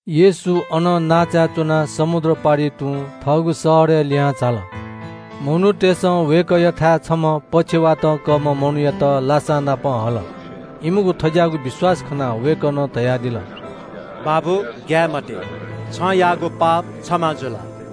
येशू अनं नांचाय् च्वनाः समुद्र पारि तुं थःगु शहरय् लिहां झाल। मनूतय्सं वय्कःयाथाय् छम्ह पक्षवातं कःम्ह मनूयात लासानापं हल। इमिगु थज्याःगु विश्वास खनाः वय्कलं धयादिल “बाबु, ग्याये मते, छं याःगु पाप क्षमा जुल।”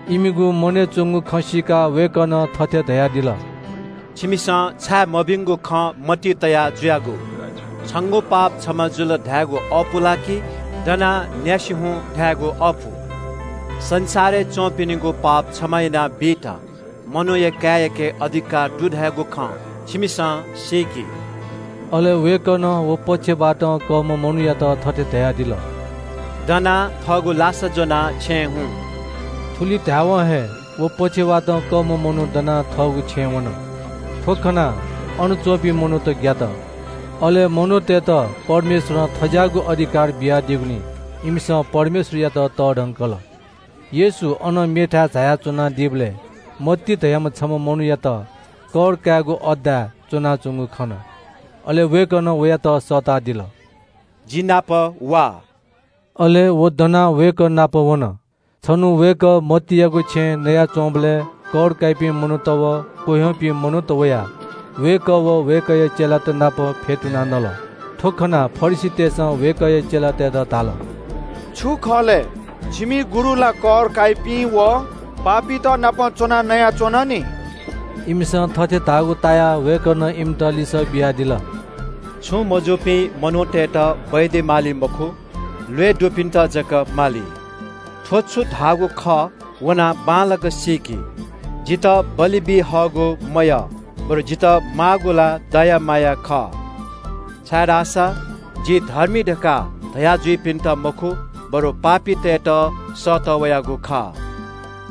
इमिगु मनय् च्वंगु खँ सीकाः वय्कलं थथे धयादिल – “छिमिसं छाय् मभिंगु खँ मतिइ तया जुयागु? ‘छंगु पाप क्षमा जुल’ धायेगु अःपु ला कि ‘दनाः न्यासि हुँ’ धायेगु अःपु? संसारय् च्वंपिनिगु पाप क्षमा यानाबीत मनूया काय्याके अधिकार दु धयागु खँ छिमिसं सीकि।” अले वय्कलं व पक्षवातं कःम्ह मनूयात थथे धयादिल – “दनाः थःगु लासा ज्वनाः छेँय् हुँ।” थुलि धायेवं हे व पक्षवातं कःम्ह मनू दनाः थःगु छेँय् वन। थ्व खनाः अन च्वंपिं मनूत ग्यात। अले मनूतय्त परमेश्वरं थज्याःगु अधिकार बियादीगुलिं इमिसं परमेश्वरयात तःधंकल। येशू अनं मेथाय् झायाच्वनादीबलय् मत्ती धयाम्ह छम्ह मनूयात कर कायेगु अड्डाय् च्वनाच्वंगु खन। अले वय्कलं वयात सःतादिल – “जि नाप वा।” अले व दनाः वय्कः नाप वन। छन्हु वय्कः मत्तीयागु छेँय् पाहां जुयाच्वंबलय् कर काइपिं मनूत व पापी मनूत नं वयाः वय्कः व वय्कःया चेलात नाप फ्यतुनाः भ्वय् नल। थ्व खनाः फरिसीतय्सं वय्कःया चेलातय्त धाल – “थ्व छु खः? छिमि गुरु ला कर काइपिं व पापीत नाप च्वनाः नयाच्वन नि?” इमिसं थथे धाःगु तायाः वय्कलं इमित लिसः बियादिल – “छुं मजूपिं मनूतय्त डाक्टर माली मखु, ल्वय् दुपिन्त जक माली। थ्व छु धाःगु खः वनाः बांलाक सीकि – ‘जितः बलि बी हःगु मयः, बरु जितः माःगु ला दया माया खः’ छाय्धाःसा ‘जि धर्मी’ धकाः धया जुइपिन्त मखु, बरु पापीतय्त सःतः वयागु खः।”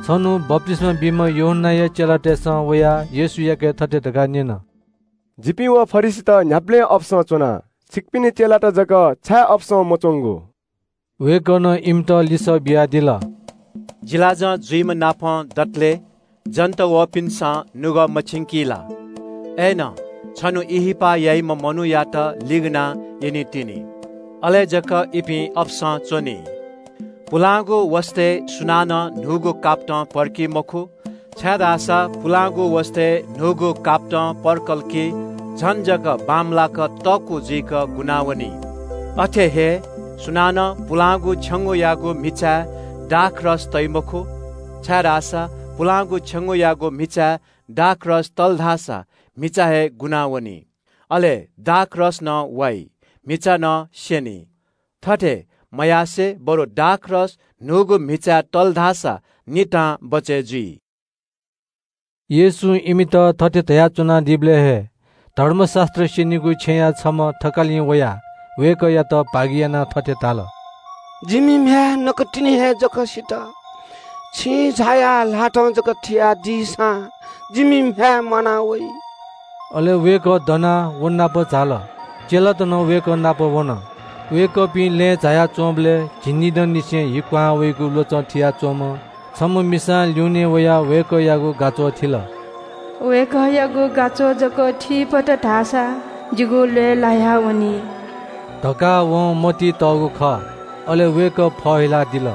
छन्हु बप्तिस्मा बीम्ह यूहन्नाया चेलातय्सं वयाः येशूयाके थथे धकाः न्यन – “जिपिं व फरिसीत न्ह्याबलें अपसं च्वना, छिकपिनि चेलात जक छाय् अपसं मच्वंगु?” वय्कलं इमित लिसः बियादिल – “जिलाजं जुइम्हनापं दतले जन्त वःपिन्सं नुगः मछिंकी ला? अय्नं छन्हु ब्याहा याइम्ह मनूयात लिगनाः यनीतिनि। अले जक इपिं अपसं च्वनी। “पुलांगु वसतय् सुनानं न्हूगु कापतं पर्की मखु, छाय्धाःसा पुलांगु वसतय् न्हूगु कापतं पर्कल कि झन जक बांमलाक तःकू जुइक गुनावनी। “अथे हे सुनानं पुलांगु छेंगूयागु म्हिचाय् दाखरस तइ मखु, छाय्धाःसा पुलांगु छेंगूयागु म्हिचाय् दाखरस तल धाःसा म्हिचा हे गुनावनी। अले दाखरस नं वाइ, म्हिचा नं स्यनी। थथे मयासें बरु दाखरस न्हूगु म्हिचाय् तल धाःसा नितां बचय् जुइ।” येशूं इमित थथे धयाच्वनादीबलय् हे धर्मशास्त्र स्यनीगु छेँया छम्ह थकालिं वयाः वय्कःयात भागियानाः थथे धाल – “जिमि म्ह्याय् नकतिनि हे जक सित। छिं झायाः ल्हातं जक थियादीसां जिमि म्ह्याय् म्वाना वइ।” अले वय्कः दनाः व नाप झाल। चेलात नं वय्कः नाप वन। वय्कःपिं लँय् झाया च्वंबलय् झिंनिदंनिसें हि क्वहां वइगु ल्वचं कयाच्वंम्ह छम्ह मिसां ल्यूनें वयाः वय्कःयागु गाच्वः थिल। “वय्कःयागु गाच्वः जक थी फत धाःसा जिगु ल्वय् लायावनी” धकाः वं मतिइ तःगु खः। अले वय्कः फहिलादिल।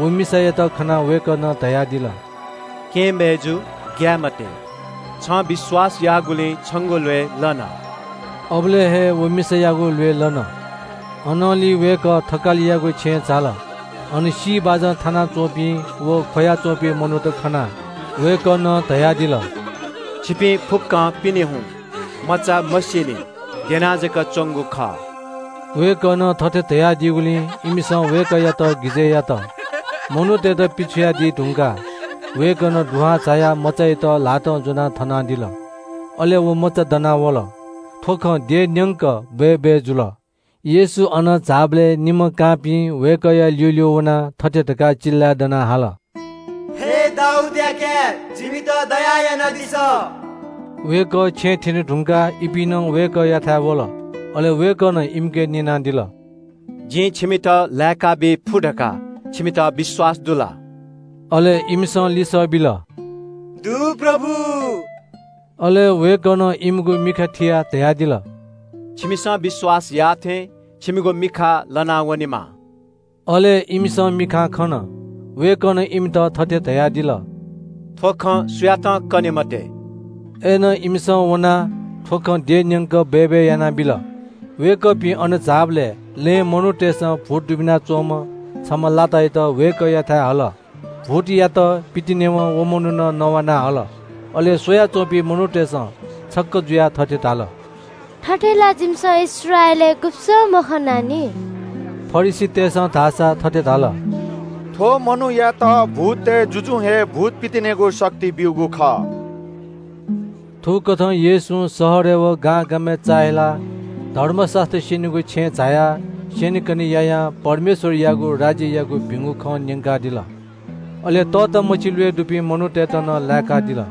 व मिसायात खनाः वय्कलं धयादिल – “केहेँ मय्जु, ग्याये मते। छं विश्वास याःगुलिं छंगु ल्वय् लन।” अबलय् हे व मिसायागु ल्वय् लन। अनंलि वय्कः थकालियागु छेँय् झाल। अन सी बाजं थानाच्वंपिं व ख्वया च्वंपिं मनूत खनाः वय्कलं धयादिल – “छिपिं फुक्कं पिने हुँ। मचा मसीनि। द्यना जक च्वंगु खः।” वय्कलं थथे धयादीगुलिं इमिसं वय्कःयात हिस्यात। मनूतय्त पिछ्वयादी धुंकाः वय्कलं दुहां झायाः मचायात ल्हातं ज्वनाः थनादिल। अले व मचा दना वल। थ्व खँ देशन्यंक बय्बय् जुल। येशू अनं झाःबलय् निम्ह कांपिं वय्कःया ल्यूल्यू वनाः थथे धकाः चिल्लाय् दनाः हाल – “हे दाऊदया काय्, जिमित दया यानादिसँ।” वय्कः छेँ थ्यने धुंकाः इपिं नं वय्कःयाथाय् वल। अले वय्कलं इमिके न्यनादिल – “जिं छिमित लाय्काबी फु धकाः छिमित विश्वास दु ला?” अले इमिसं लिसः बिल – “दु, प्रभु।” अले वय्कलं इमिगु मिखा थियाः धयादिल – “छिमिसं विश्वास याःथें छिमिगु मिखा लना वनेमा।” अले इमिसं मिखां खन। वय्कलं इमित थथे धयादिल – “थ्व खँ सुयातं कने मते।” अय्नं इमिसं वनाः थ्व खँ देशन्यंक बय्बय् यानाबिल। वय्कःपिं अनं झाःबलय् लँय् मनूतय्सं भूत दुबिना च्वंम्ह छम्ह लातायात वय्कःयाथाय् हल। भूतयात पितिनेवं व मनुखं नवाना हल। अले स्वयाच्वंपिं मनूतय्सं छक्क जुयाः थथे धाल – “थथे ला जिमिसं इस्राएलय् गुब्सं मखनानि।” फरिसीतय्सं धाःसा थथे धाल – “थ्व मनूयात भूततय् जुजुं हे भूत पितिनेगु शक्ति ब्यूगु खः।” थुकथं येशूं शहरय् व गांगामय् चाःहिलाः धर्मशास्त्र स्यनीगु छेँय् झायाः स्यनेकने यायां परमेश्वरयागु राज्ययागु भिंगु खँ न्यंकादिल। अले तःतामछि ल्वय् दुपिं मनूतय्त नं लाय्कादिल।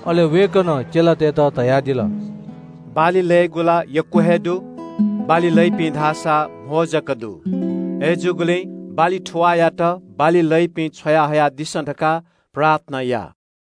अले वय्कलं चेलातय्त धयादिल – “बाली लयेगु ला यक्व हे दु, बाली लइपिं धाःसा कम जक दु। अय्जूगुलिं बाली थुवाःयात बाली लइपिं छ्वयाहयादिसँ धकाः प्रार्थना या।”